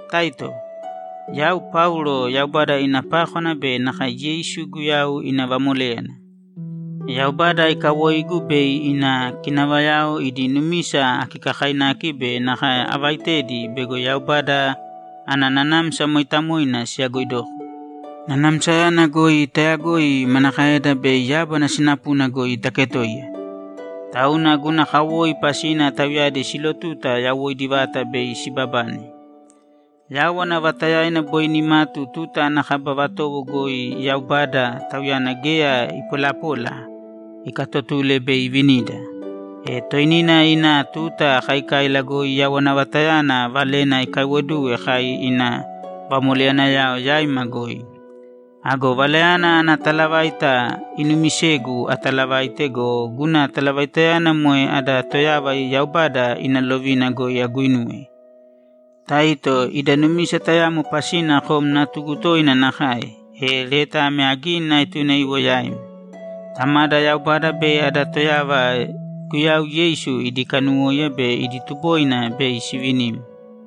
Taito, Yau Paulo, Yaubada ina pákwana be nakae Yeisu Guyau ina vamoléyana. Yaubada ikawoigu bei ina kinavayao idi numisa akikakainaki be nakae avaitedi bego Yaubada ana Nanamsa Mooitamoina siyagoidoko. Nanamsayana goi tayagoi manakaeda bei yábana sinapuna goi taketoiya. Tauna guna kawoi pasina tauyadi silotuta yawoidi vata bei sibabane. Yawana vatayana boi nimatu tuta ana kaba vatowo goi Yaubada, Tauyana geya ipolapola, ikatotule bei ivinida. E toinina ina tuta kaikaila goi yawana vatayana valena ikaiwoduwe kai ina vamoleyanayao yaima goi. Ago valayana ana talavaita inumisegu atalavaite go, guna talavaitayana moe ada Toyava Yaubada ina lovina goi aguinuwe. Taito, ida numisa tayamo pasina kom natugu toina nakae, e leta ame agini aetune iwo yaim. Tamada Yaubada be ada Toyava Guyau Yeisu idi kanuwóiya be idi tuboina bei sivinim.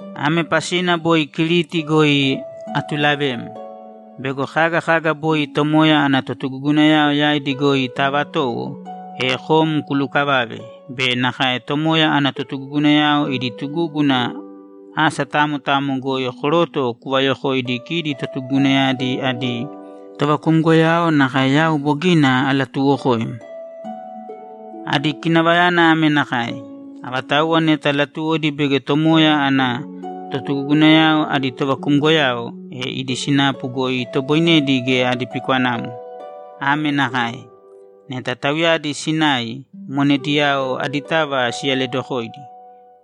Ame pasina boi Kiriti goi atulavem: Bego kaga kaga boi Tomoya ana totugugunayao yaidi goi taavatowo, e kom kulukavave be nakae Tomoya ana totugugunayao idi tugúguna asa tamo tamo goi koroto kuvayokoidi kidi tugugunayadi adi tovakumgoyao nakae yau bogina alatuuwokoim. Adi kinavayana ame nakae: Avatauwa neta latuwodi bego Tomoya ana totugugunayao adi tovakumgoyao, e idi sinapu goi itoboinedi geya adi pikwanamo. Ame nakae: Neta tauyadi sinai, monediyao aditava siyaledokōidi.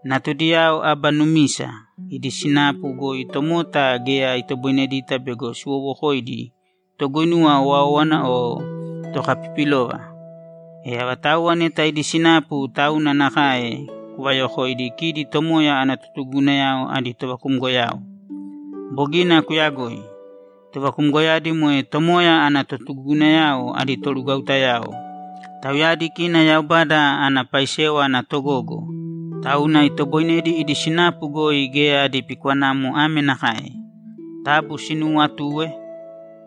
Natudiyao aba numisa, idi sinapu goi tomota geya itoboinedita bego siwowokoidi toguinuwa owáowana o tokapipilova. E avatauwa neta idi sinapu tauna nakae kuvayokōidi kidi Tomoya ana totugugunayao adi tovakumgoyao. Bogina kuyagoi. Tovakumgoyadi moe Tomoya ana totugugunayao adi torugwautayao; tauyadi kina Yaubada ana paisewa ana togogo, tauna itoboinedi idi sinapu goi geya adi pikwanamo ame nakae: Taabu sinuuwatūe,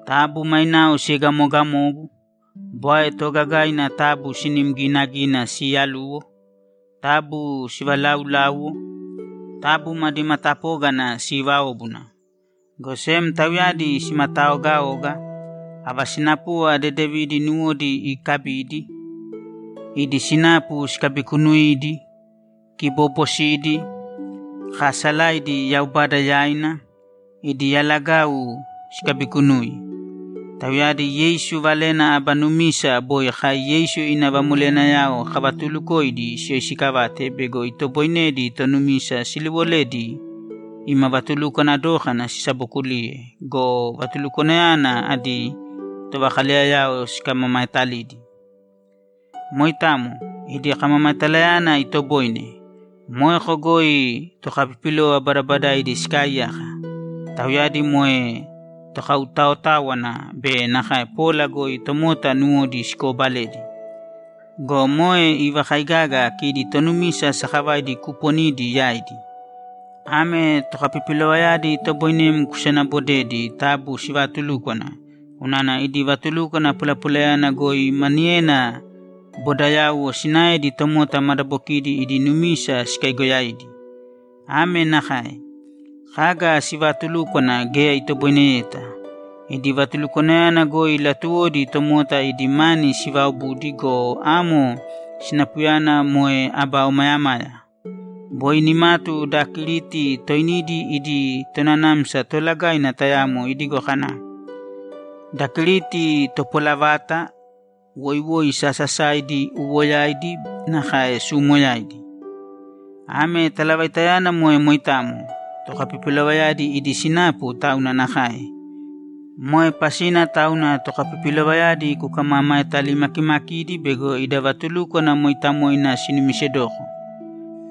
taabu mainao siegamoogamōgu, bwae toogagaina taabu sinim ginagīna siyaluwo, taabu sivalaaulāuwo, taabu madi matapógana siivāobuna. Go sem tauyadi simataaogaōga, ava sinapuva dedevidi nuwodi ikabīdi, idi sinapu sikabikunuīdi, kiboobosidi, kaasalaidi Yaubada yaina, idi yalagau sikabikunūi. Tauyadi Yeisu valena aba numisa boi kai Yeisu ina vamoleyanayao kavatuulukoidi siyoisikavāte bego itoboinedi tonumisa siliwoledi ima vatulukwana dókana sisabokuliye go, vatulukwanayana adi tovakaleyayao sikamamaetalidi. Moitamo, idi kamamaetalayana itoboine. Moeko goi tokapipilova badabadaidi sikaaiyaka. Tauyadi moe tokautaotáwana be nakae pola goi tomota nuwodi sikoobaledi. Go moe ivakaigaga kidi tonumisa sakavaidi kuuponidi yaidi. Ame tokapipilovayadi itoboinem kusanabodedi taabu sivaatulūkwana, unana idi vatulukwana polapolayana goi maniyena bodayauwo sinaedi tomota madabokidi idi numisa sikaigoyaidi. Ame nakae: Kaga sivaatulúkwana geya itoboineyeta. Idi vatulukwanayana goi latuwodi tomota idi mani sivaobudi go, amo sinapuyana moe aba omayamaya. Boi nimatu da Kiriti toinidi idi tonanamsa toolagaina tayamo idigo kana, ‘Da Kiriti topola vata, woiwoi sasasaidi, uuwoyaidi nakae suumoyaidi!’ Ame talavaitayana moe moitamo; tokapipilovayadi idi sinapu tauna nakae! Moe pasina tauna tokapipilovayadi kukamamaetalimakimakīdi bego ida vatulúkwana moitamo sinumisedoko.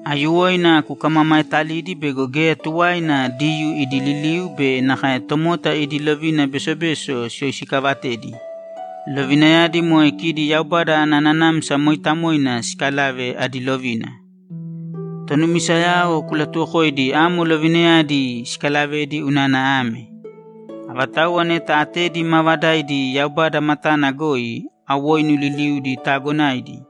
Aiyuwoina kukamamaetalīdi bego geya tuwaina Diyuu idi liliu be nakae tomota idi lovina besobeso siyoisikaavatedi; lovinayadi moe kidi Yaubada ana Nanamsa Mooitamoina siikalave adi lovina. Tonumisayao kulatuwokōidi amo lovinayadi sikalavedi unana ame: Avatauwa neta atedi maavadaidi Yaubada matana goi, awoinu liliudi taagonaidi.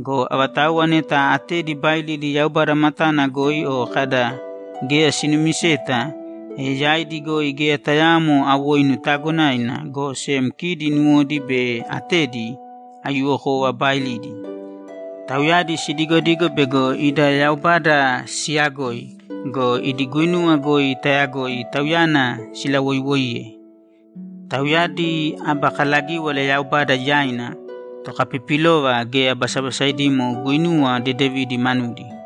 Go avatauwa neta atedi baailidi Yaubada matana goi o kada, ‘Geya sinumiseta’, e yaidi goi geya tayaamo awoinu taagonaina, go sem kidi nuwodi be atedi, aiyuwokova, baailidi. Tauyadi sidigodigo bego ida Yaubada siyagoi go, idi guinuwa goi tayagoi Tauyana silawoiwoiye. Tauyadi aba kalagíwala Yaubada yaina, tokapipilova, geya basabasaidimo guinuwa dedevidi manudi.